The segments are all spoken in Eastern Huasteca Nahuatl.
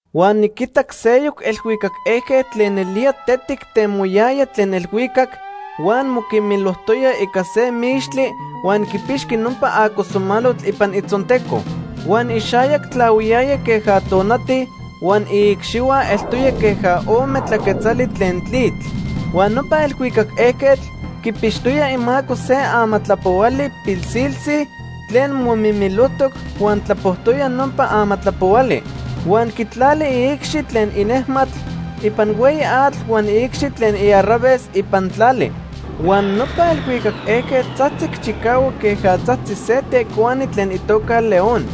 Huan niquitac seyoc elhuicac ejquetl tlen nelía tetic temoyaya tlen elhuicac, huan moquimilojtoya ica se mixtli huan quipixqui nopa acosamalotl ipan itzonteco. Huan ixayac tlahuiyaya queja tonati huan iicxihua eltoya queja ome tlaquetzali tlen tlitl. Huan nopa elhuicac ejquetl quipixtoya imaco se amatlapohuali pilsiltzi tlen momimilijtoc huan tlapojtoya nopa amatlapohuali. Huan quitlali iicxi tlen inejmatl ipan hueyi atl huan iicxi tlen iarraves ipan tlali. Huan nopa elhuicac ejquetl tzajtzic chicahuac queja tzajtzi se tecuani tlen itoca león.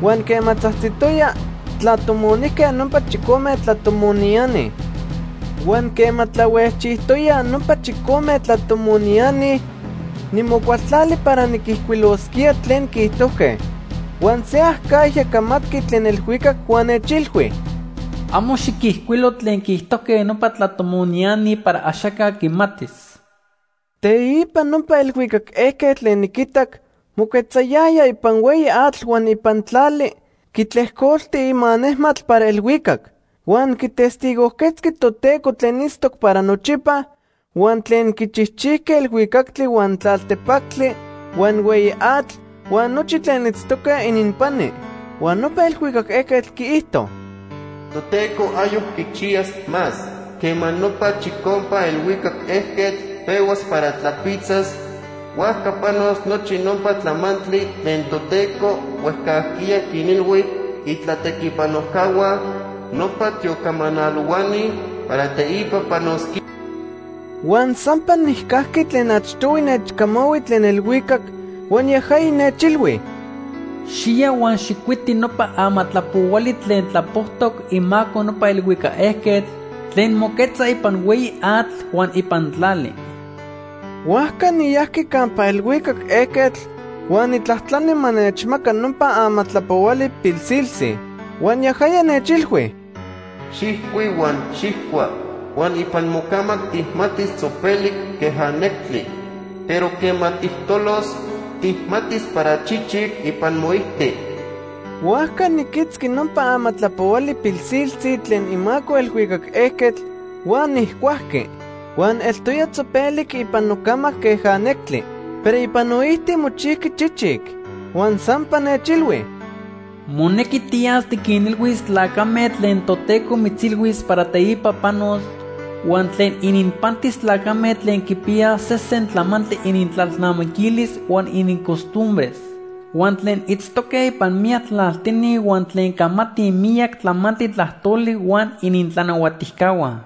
Huan quema tzajtzitoya, tlatomonijque nopa chicome tlatomoniani. Huan quema tlahuejchijtoyaj nopa chicome tlatomoniani, nimocualtlali para niquijcuilosquía tlen quiijtojque. Huan se acajya camatqui tlen elhuicac huan nechilhui: “Amo xiquijcuilo tlen quiijtojque nopa tlatomoniani para axaca quimatis.” Teipa nopa elhuicac ejquetl tlen niquitac moquetzayaya ipan hueyi atl huan ipan tlali, quitlejcolti ima nejmatl para elhuicac. Huan quitestigojquetzqui Toteco tlen itztoc para nochipa huan tlen quichijchijqui elhuicactli, huan tlaltepactli, huan hueyi atl huan nochi tlen itztoque ininpani. Huan nopa elhuicac ejquetl quiijto: “Toteco ayoc quichiyas más. Quema nopa chicompa elhuicac ejquetl pehuas para tlapitzas, huajca panos nochi nopa tlamantli tlen Toteco huejcajquiya quinilhui itlatequipanojcahua, nopa tiocamanalohuani, para teipa panosquía.” Huan sampa nijcajqui tlen achtohui nechcamahui tlen elhuicac, huan yajaya nechilhui: “Xiya huan xijcuiti nopa amatlapohuali tlen tlapojtoc imaco nopa elhuicac ejquetl tlen moquetza ipan hueyi atl huan ipan tlali.” Huajca niyajqui campa elhuicac ejquetl huan nijtlajtlani ma nechmaca nopa amatlapohuali pilsiltzi. Huan yajaya nechilhui: “Xijcui huan xijcua. Huan ipan mocamac tijmatis tzopelic queja nectli, pero quema tijtolos, tijmatis para chichic ipan moijti.” Huajca niquitzqui nopa amatlapohuali pilsiltzi tlen imaco elhuicac ejquetl huan nijcuajqui. Huan eltoya tzopelic ipan nocamac queja nectli, pero ipan noijti mochijqui chichic. Huan sampa nechilhui: “Monequi tiyas tiquinilhuis tlacame tlen Toteco mitzilhuis para teipa panos huan tlen ininpantis tlacame tlen quipiyaj sesen tlamantli inintlalnamiquilis huan inincostumbres, huan tlen itztoque ipan miyac tlaltini huan tlen camatij miyac tlamantli tlajtoli huan inintlanahuatijcahua.”